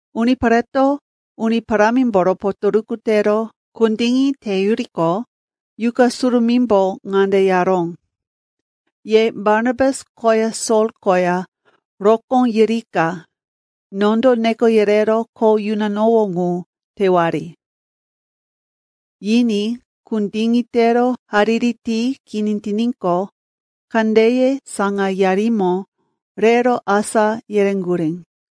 Unipareto Uni Parámimboro potoruku tero kundiŋi teyuriqo, Yuqa Surumímbo ŋande yaró, “Ye Barnabas koya Sol koya rokó yirika nondo neko yerero kho yunanowó ŋu tewari.” Yiní kundiŋi tero hariri ti kini tiníqo, kandeye saŋayarimo rero asá yereŋgurí.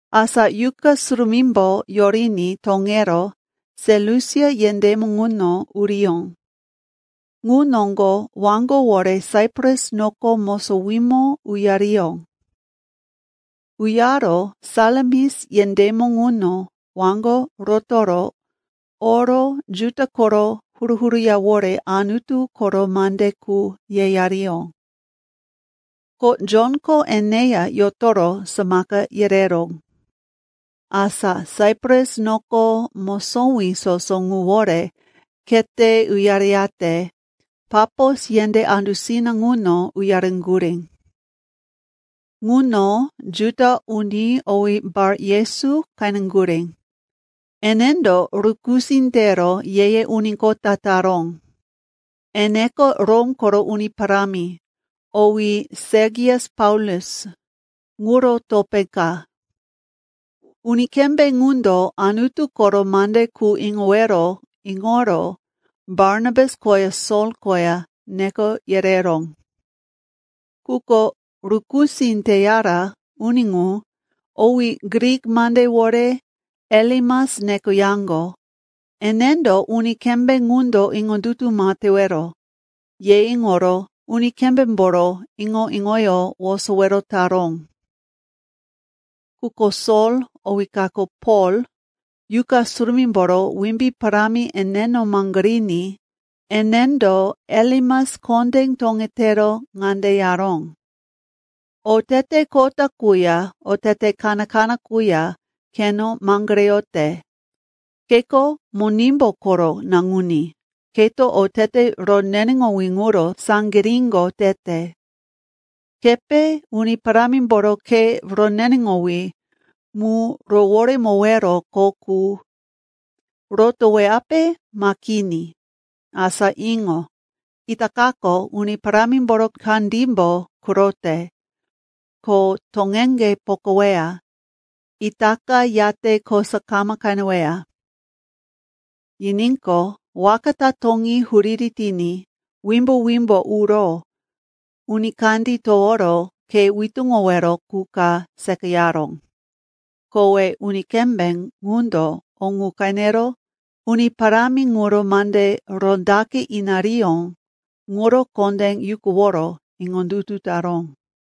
Asa Yuqa Surumímbo yoriní toŋero Selusia yendémo ŋuno uriyó. Ŋu noŋgo waŋgowore Saipras noko mosowímo uyariyó. Uyaro Salamis yendémo ŋuno waŋgo rotoro oro Juda koro huru-huru yawore Anutu koro mande qu yeyariyó. Ko Jonko eneya yotoro samaka yereró. Asa Saipras noko mosowí soso ŋuwore khete uyareyate Papos yendé andusina ŋuno uyareŋgurí. Ŋuno Juda uni owí Bar-Yesu qeneŋgurí, enendo rukusí tero ye-ye uni kota taró. Eneko Rom koro uni parámi, owí Sergius Paulus, ŋuro topé ka. Uni kembé ŋundo Anutu koro mande qu iŋowero iŋoro Barnabas koya Sol koya neko yereró. Quko rukusí teyara uni ŋu, owí Grik mandewore Elimas nekoyaŋgo, enendo, uni kembé ŋundo iŋondutu ma tewero, ye iŋoro uni kembémboro iŋo-iŋoyó wosowero taró. Quko Sol, owí kako Pol, Yuqa Surumímboro wimbí parámi eneno maŋgoriní enendo Elimas kondé toŋetero ŋande yaró, “Otete kota quya otete kaná-kaná quya keno maŋgoreyote! Keko Monimbu koro naŋuní, keto otete roneneŋowí ŋuro saŋgiríŋo tete! Kepe Uni Parámimboro khe roneneŋowí mu roworemowero kho ŋu rotoweyape ma kini? Asa iŋo! Itakako Uni Parámimboro kandímbo kurote, ko toŋeŋge pokaweya. Itaka yate kosa kama qeneweya.” Yiníqo, waka ta toŋí huriri tiní wimbo-wimbo uro uni kandí toworo khe witúŋowero qu ka seqayaró. Kowe uni kembé ŋundo o ŋu qenero, Uni Parámi ŋuro mande rondaqe inariyó ŋuro kondé yukuworo iŋondutu taró.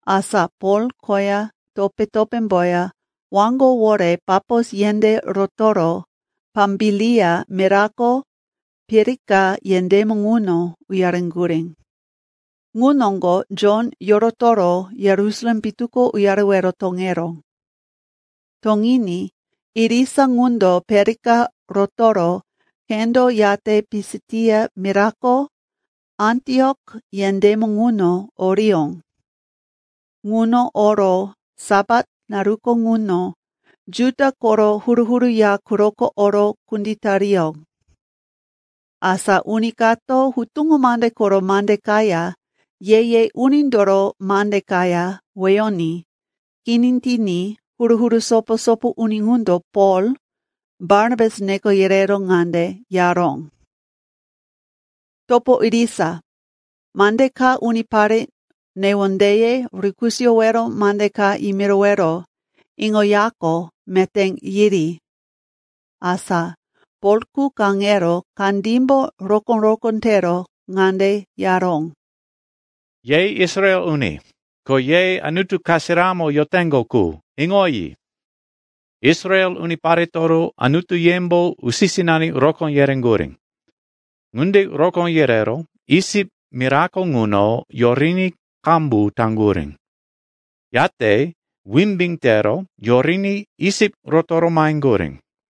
Asa Pol koya topé-topémboya waŋgowore Papos yendé rotoro Pambilia mirako Perika yendémo ŋuno uyareŋgurí. Ŋu noŋgo Jon yorotoro Yerusalem pitu ko uyarewero toŋeró. Toŋiní irisa ŋundo Perika rotoro khendo yate Pisitia mirako Antiok yendémo ŋuno oriyó. Ŋuno oro Sapat naruko ŋuno Juda koro huru-huru ya quroko oro kunditariyó. Asa uni kato Hutuŋo Mande koro mande kaya Ye-ye Unindoro mande kaya weyoní kini tiní huru-huru sopo-sopo uni ŋundo Pol, Barnabas neko yerero ŋande yaró, “Topo irisa, mande ka unipare newondeye rukisoyowero mande ka yimirowero iŋoyaqo meté yiri.” Asa Polko kaŋero kandímbo rokó-rokó tero ŋande yaró, “Ye Israel uni, ko ye Anutu kasiramo yoteŋgo qu, iŋoyi. Israel uniparetoro Anutuyembo usi-sinani rokó yereŋgurí. Ŋunde rokó yerero Isip mirako ŋuno yoriní qambu taŋgurí. Yate wimbí tero yoriní Isip rotoro maheŋgurí.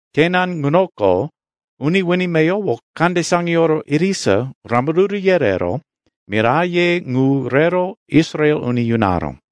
Kenan ŋunoko uni wini meyowo kande saŋiyoro irisa rambaruru yerero miraye ŋu rero Israel uni yunaró.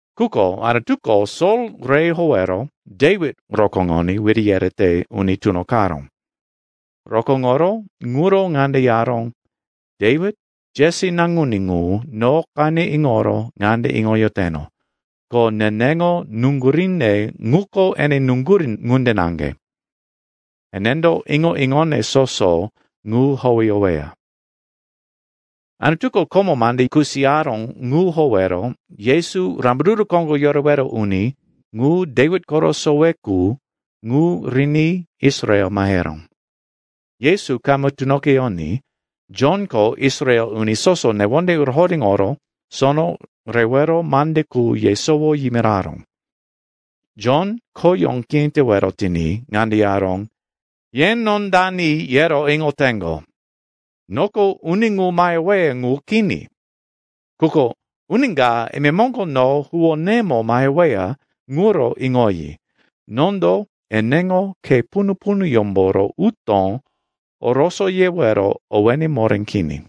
Quko Anutuko Sol re howero Dewit rokóŋoní wiri yerete uni tunoqaró. Rokóŋoro ŋuro ŋande yaró, ‘Dewit, Jesi naŋuní ŋu, no qene iŋoro ŋande iŋoyoteno, ko neneŋo nuŋguríne ŋuko ene nuŋgurí ŋunde naŋge. Enendo iŋo-iŋone soso ŋu howeyoweya.’ “Anutuko komo mande kusiyaró ŋu howero Yesu, Rambaruru Koŋgo Yorewero Uni ŋu, Dewit koro sowe qu, ŋu riní Israel maheró. Yesu kama tunoqeyoní Jonko Israel uni soso newonde rohoréŋoro sono rewero mande qu yesowo yimiraró. Jon khoyó kini tewero tiní ŋande yaró, ‘Ye no dani, yero iŋoteŋgo? Noko uni ŋu maheweya ŋu kini. Quko uni ka imemoŋgo no huwónemo maheweya ŋuro iŋoyi, nondo eneŋo khe punu-punuyómboro utó orosoyewero owéne moré kini.’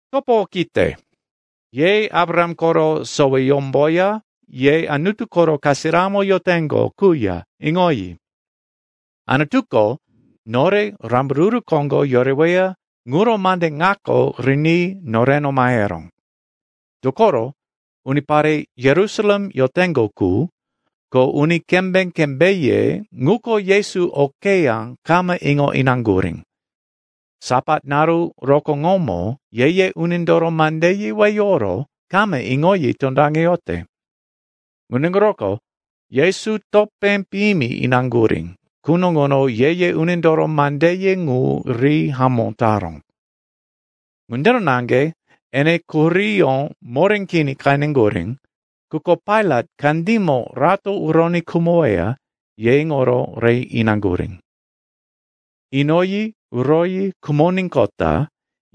“Topo okite, ye Abraham koro soweyómboya ye Anutu koro kasiramo yoteŋgo quya, iŋoyi. Anutuko nore rambaruru koŋgo yoreweya ŋuro mande ŋako riní noreno maheró. Dokoro unipare Yerusalem yoteŋgo qu, ko uni kembé-kembéye ŋuko Yesu okeyá kama iŋo inaŋgurí. Sapat naru rokóŋomo ye-ye unindoro mandeye weyoro kama iŋoyi tondaŋeyote. Ŋunde ŋuroko Yesu topé piyimi inaŋgurí quno ŋuno ye-ye unindoro mandeye ŋu ri hamó taró. Ŋundiro naŋge ene quhuríyó moré kini qeneŋgurí, quko Pailat kandímo rato uroní khumoweya, ye iŋoro re inaŋgurí. Inoyi uroyi khumoníqota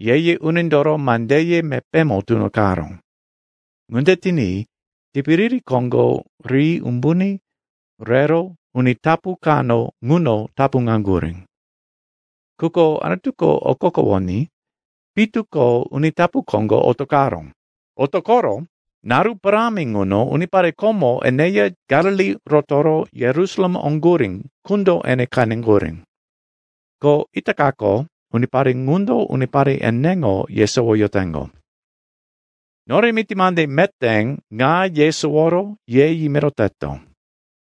ye-ye unindoro mandeye mepémo tunoqaró. Ŋunde tiní tipiriri koŋgo ri umbuní rero uni tapu kano ŋuno tapuŋaŋgurí. Quko Anutuko okokowoní pitu ko uni tapu koŋgo otoqaró. Otoqoro naru parámi ŋuno unipare komo eneya Galili rotoro Yerusalem oŋgurí qundo ene qeneŋgurí. Ko itakako unipare ŋundo unipare eneŋo yesowoyoteŋgo. “Nore miti mande meté ŋa yesoworo ye yimiroteto.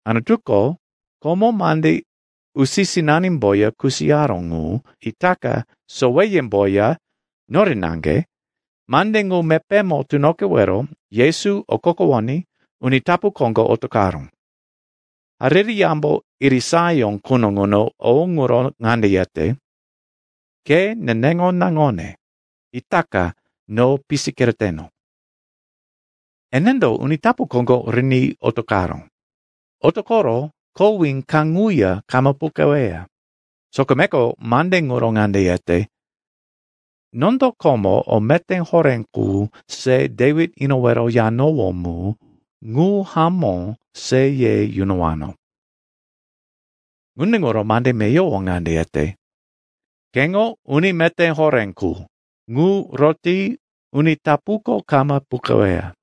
Anutuko komo mande usi-sinanimboya kusiyaró ŋu itaka soweyemboya, nore naŋge, mande ŋu mepémo tunoqewero Yesu okokowoní uni tapu koŋgo otoqaró. Hariri Yambo irisayó quno ŋuno o ŋuro ŋande yete, “‘Ke neneŋo naŋone; Itaka no pisi kereteno.’ Enendo uni tapu koŋgo riní otoqaró. Otoqoro kowí kaŋuya kama puqeweya. Sokomeko mande ŋuro ŋande yete, “‘Nondo komo o meté horé qu se Dewit inowero yanowó mu, ŋu hamó se ye yunowano.’ Ŋunde ŋuro mande meyowo ŋande yete, “‘Keŋo uni meté horé qu, ŋu roti uni tapuko kama puqeweya.’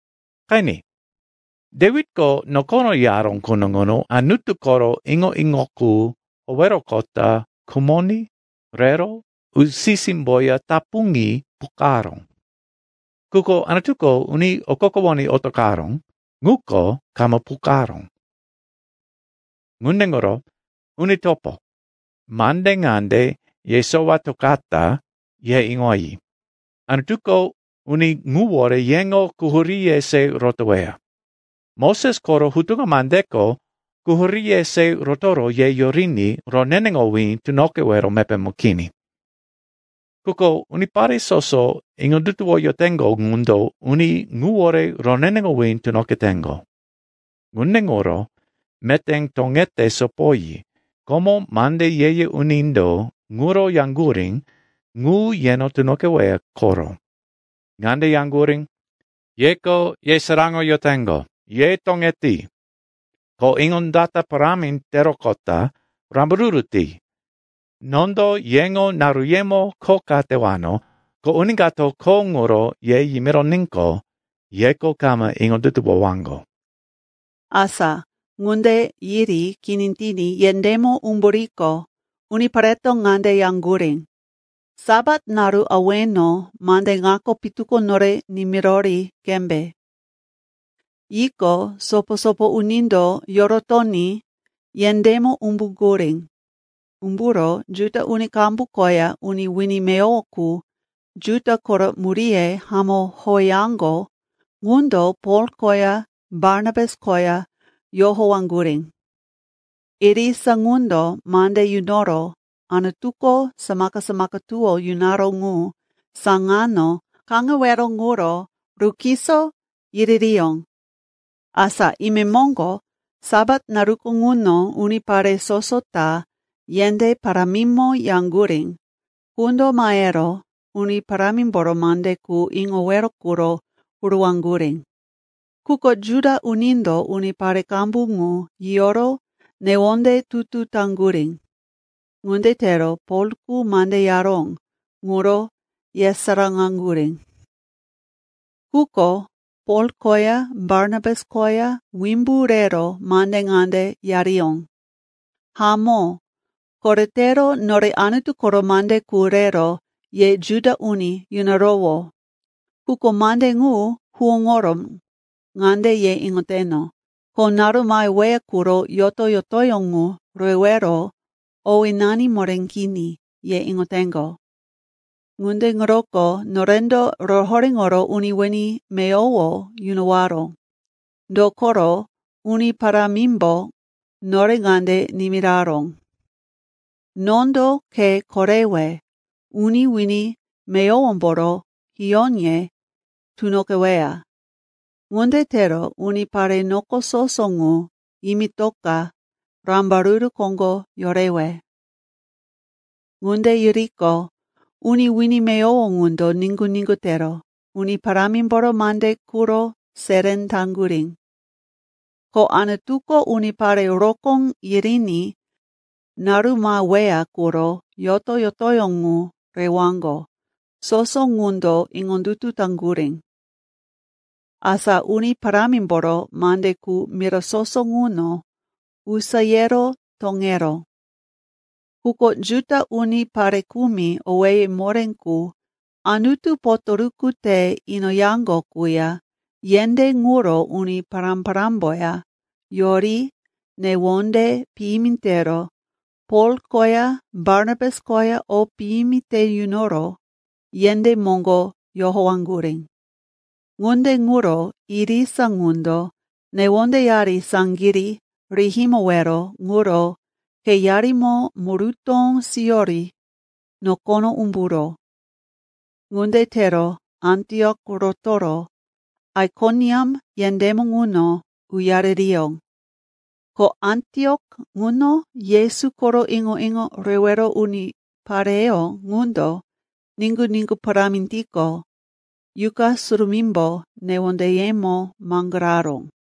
“Qeni, Dewitko nokono yaró quno ŋuno Anutu koro iŋo-iŋo qu howeroqota khumoní rero usi-símboya tapuŋi puqaró. Quko Anutuko uni okokowoní otoqaró, ŋuko kama puqaró. “Ŋunde ŋuro, uni topo, mande ŋande yesowatokata, ye iŋoyi, Anutuko uni ŋuwore yeŋo quhuríye se rotoweya. Moses koro hutuŋo mandeko quhuríye se rotoro ye yoriní roneneŋowí tunoqewero mepémo kini. Quko unipare soso iŋondutuwoyoteŋgo ŋundo uni ŋuwore roneneŋowí tunoqeteŋgo. Ŋunde ŋuro meté toŋete sopoyi, komo mande ye-ye unindo ŋuro yaŋgurí ŋu yeno tunoqeweya koro. Ŋande yaŋgurí, “‘Yeko yesaráŋoyoteŋgo, ye toŋeti, ko iŋondata parámi teroqota rambaruru ti! Nondo yeŋo naruyemo kho ka tewano, ko uni kato kho ŋuro ye yimironíqo, yeko kama iŋondutuwowaŋgo.’” Asa ŋunde yiri kini tiní yendémo umburiqo, unipareto ŋande yaŋgurí, “Sapat naru aweno mande ŋako pitu ko nore nimirori qembe.” Yiqo, sopo-sopo unindo yorotoní yendémo umbuŋgurí. Umburo Juda uni qambu koya uni wini meyowo qu Juda koro muríye hamó howeyaŋgo ŋundo Pol koya Barnabas koya yohowaŋgurí. Irisa ŋundo mande yunoro Anutuko samaka-samaka tuwó yunaró ŋu saŋano kaŋewero ŋuro rukiso yiririyó. Asa imemoŋgo Sapat naruko ŋuno unipare soso ta yendé parámimo yaŋgurí qundo mahero Uni Parámimboro mande qu iŋowero quro huruwaŋgurí. Quko Juda unindo unipare qambu ŋu yiyoro newonde tutu taŋgurí. Ŋunde tero Polko mande yaró ŋuro yesaráŋaŋgurí. Quko Pol koya Barnabas koya wimbu rero mande ŋande yariyó, “Hamó, koretero nore Anutu koro mande qu rero ye Juda uni yunarowó. Quko mande ŋu huwóŋoro ŋande ye iŋoteŋgo, ko naru maheweya quro yoto-yotoyó ŋu rewero owénani moré kini, ye iŋoteŋgo. Ŋunde ŋuroko norendo rohoréŋoro uni wini meyowo yunowaro. Dokoro, Uni Parámimbo nore ŋande nimiraró, “‘Nondo ke korewe uni wini meyowomboro hiyóye tunoqeweya. Ŋunde tero unipare noko soso ŋu yimitoka rambaruru koŋgo yorewe.’” Ŋunde yiriqo, uni wini meyowo ŋundo niŋgu-niŋgu tero Uni Parámimboro mande quro seré taŋgurí. Ko Anutuko unipare rokó yiriní naru maheweya quro yoto-yotoyó ŋu rewaŋgo, soso ŋundo iŋondutu taŋgurí. Asa Uni Parámimboro mande qu mira soso ŋuno usayero toŋeró. Quko Juda unindo pare kumi owéye moré qu Anutu potoruku te inoyaŋgo quya yendé ŋuro uni pará-parámboya yori newonde piyimi tero Pol koya Barnabas koya o piyimi te yunoro yendé moŋgo yohowaŋgurí. Ŋunde ŋuro irisa ŋundo newondeyari saŋgirí rihimowero ŋuro kheyarimo murutó siyori nokono umburó. Ŋunde tero Antiok rotoro Aikoniam yendémo ŋuno uyaririyó. Ko Antiok ŋuno Yesu koro iŋo-iŋo rewero unipareyó ŋundo niŋgu-niŋgu parámi tiqo, Yuqa Surumímbo newondeyemo maŋgoraró.